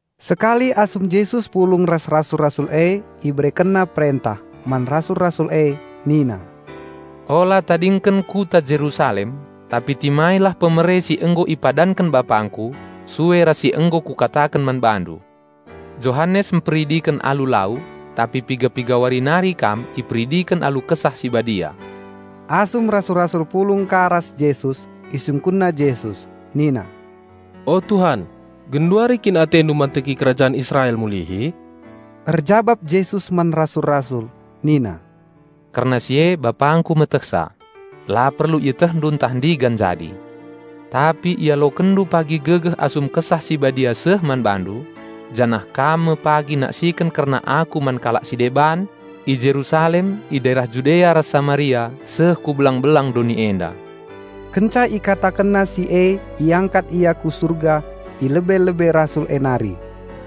Sekali asum Jesus pulung ras rasul-rasul e IberekenNa perentah man rasul-rasul e nina, "Ula tadingken Kota Jerusalem tapi timailah pemere si nggo ipadanken BapangKu, sue ras si nggo Kukataken man bandu. Johanes mperidiken alu lau, tapi piga-piga wari nari kam iperidiken alu Kesah Si Badia." Asum rasul-rasul pulung ka ras Jesus, isungkunna Jesus nina, "O Tuhan, genduari kin atendu manteki kerajan Israel mulihi?" Erjabap Jesus man rasul-rasul nina, "Kerna si e BapangKu metehsa; la perlu ietehndu ntah ndigan jadi. Tapi ialokenndu pagi gegeh asum Kesah Si Badia seh man bandu. Janah kam me pagi naksiken kerna Aku man kalak si deban, i Jerusalem, i daerah Judea ras Samaria seh ku belang-belang doni enda." Kenca IkatakenNa si e iangkat Ia ku Surga i lebe-lebe rasul e nari,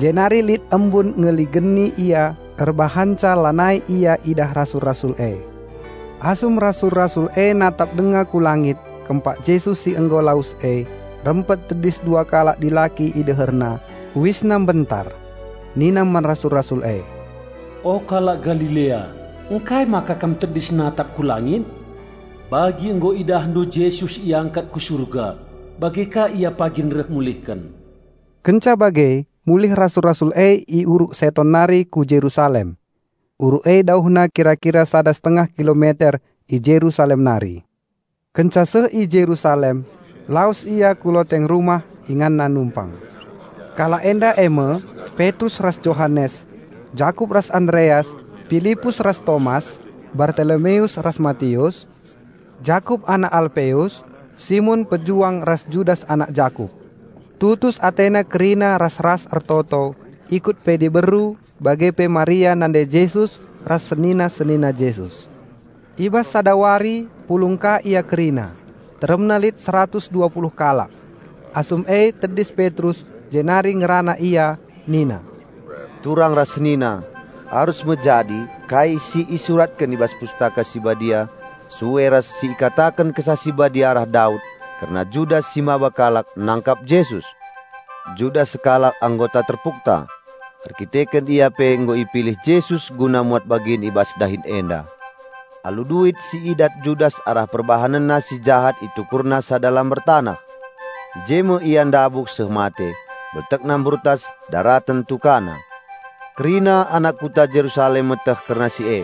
jenari lit embun ngeligeni Ia erbahanca lanai Ia idah rasul-rasul e. Asum rasul-rasul e natap denga ku langit, kempak Jesus si nggo lawes e, rempet tedis dua kalak dilaki i deherna, uisna mbentar. Nina man rasul-rasul e, "O kalak Galilea, ngkai maka kam tedis natap ku langit? Bagi nggo idahndu Jesus iangkat ku Surga, bage ka Ia pagin reh mulihken." Kenca bage mulih rasul-rasul e i Uruk Seton nari ku Jerusalem. Uruk e dauhna kira-kira sada setengah kilometer i Jerusalem nari. Kenca seh i Jerusalem, lawes ia ku loteng rumah inganna numpang. Kalak enda eme: Petrus ras Johanes, Jakup ras Andreas, Pilipus ras Tomas, Bartolomeus ras Matius, Jakup anak Alpeus, Simon Pejuang ras Judas anak Jakup. Tutus atena kerina ras-ras ertoto, ikut pe diberu, bage pe Maria nande Jesus ras senina-senina Jesus. I bas sada wari pulung ka ia kerina, teremna lit seratus dua puluh kalak. Asum e tedis Petrus jenari ngerana ia nina, "Turang ras senina, arus me jadi kai si isuratken i bas Pustaka Si Badia sue ras si ikataken Kesah Si Badia arah Daud kerna Judas si maba kalak nangkap Jesus. Judas sekalak anggota terpukta, erkiteken ia pe nggo ipilih Jesus guna muat bagin i bas dahin enda." (Alu duit si idat Judas arah perbahanenna si jahat itukurna sada lambar taneh. I je me ia ndabuh seh mate. Beltekna mburtas ndaraten tukana. Kerina anak Kota Jerusalem meteh kerna si e.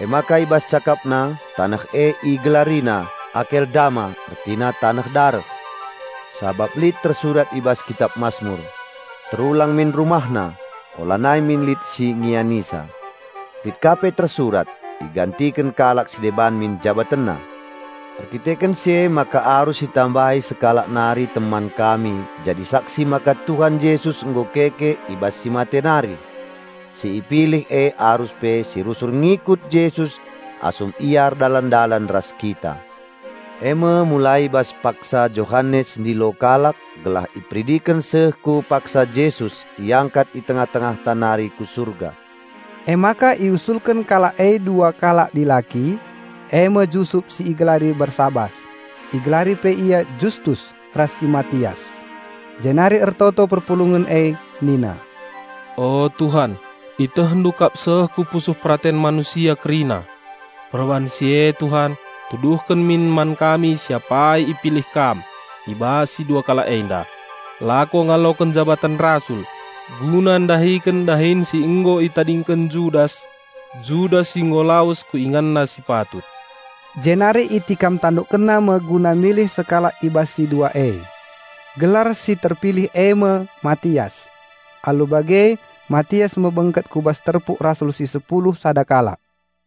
Emaka i bas cakapna taneh e igelarina "Akeldama" ertina Taneh Dareh.) "Sabap lit tersurat i bas Kitap Masmur, 'Terulang min rumahna, ulanai min lit si ngianisa'. Lit ka pe tersurat, 'Igantiken kalak si deban min jabatenna.' Erdandanken si emaka arus itambahi sekalak nari teman kami jadi saksi maka Tuhan Jesus nggo keke i bas si mate nari. Si ipilih e arus pe si rusur ngikut Jesus asum Ia erdalan-dalan ras kita. Eme mulai i bas paksa Johanes ndilo kalak gelah iperidiken seh ku paksa Jesus iangkat i tengah-tengahta nari ku Surga." Emaka iusulken kalak e dua kalak dilaki, eme Jusup si igelari Barsabas (igelari pe ia Justus) ras si Matias. Jenari ertoto perpulungen e nina, "O Tuhan ItehNdu kap seh ku pusuh peraten manusia kerina. Perbahan si e Tuhan, tuduhken min man kami si apai ipilih Kam i bas si dua kalak enda, lako ngaloken jabaten rasul, guna ndahiken dahin si nggo itadingken Judas, Judas si nggo lawes ku inganna si patut." Jenari itikam tanduk kalak eme guna milih sekalak i bas si dua e. Gelar si terpilih eme Matias. Alu bage Matias me bengket ku bas terpuk rasul si sepulu sada kalak.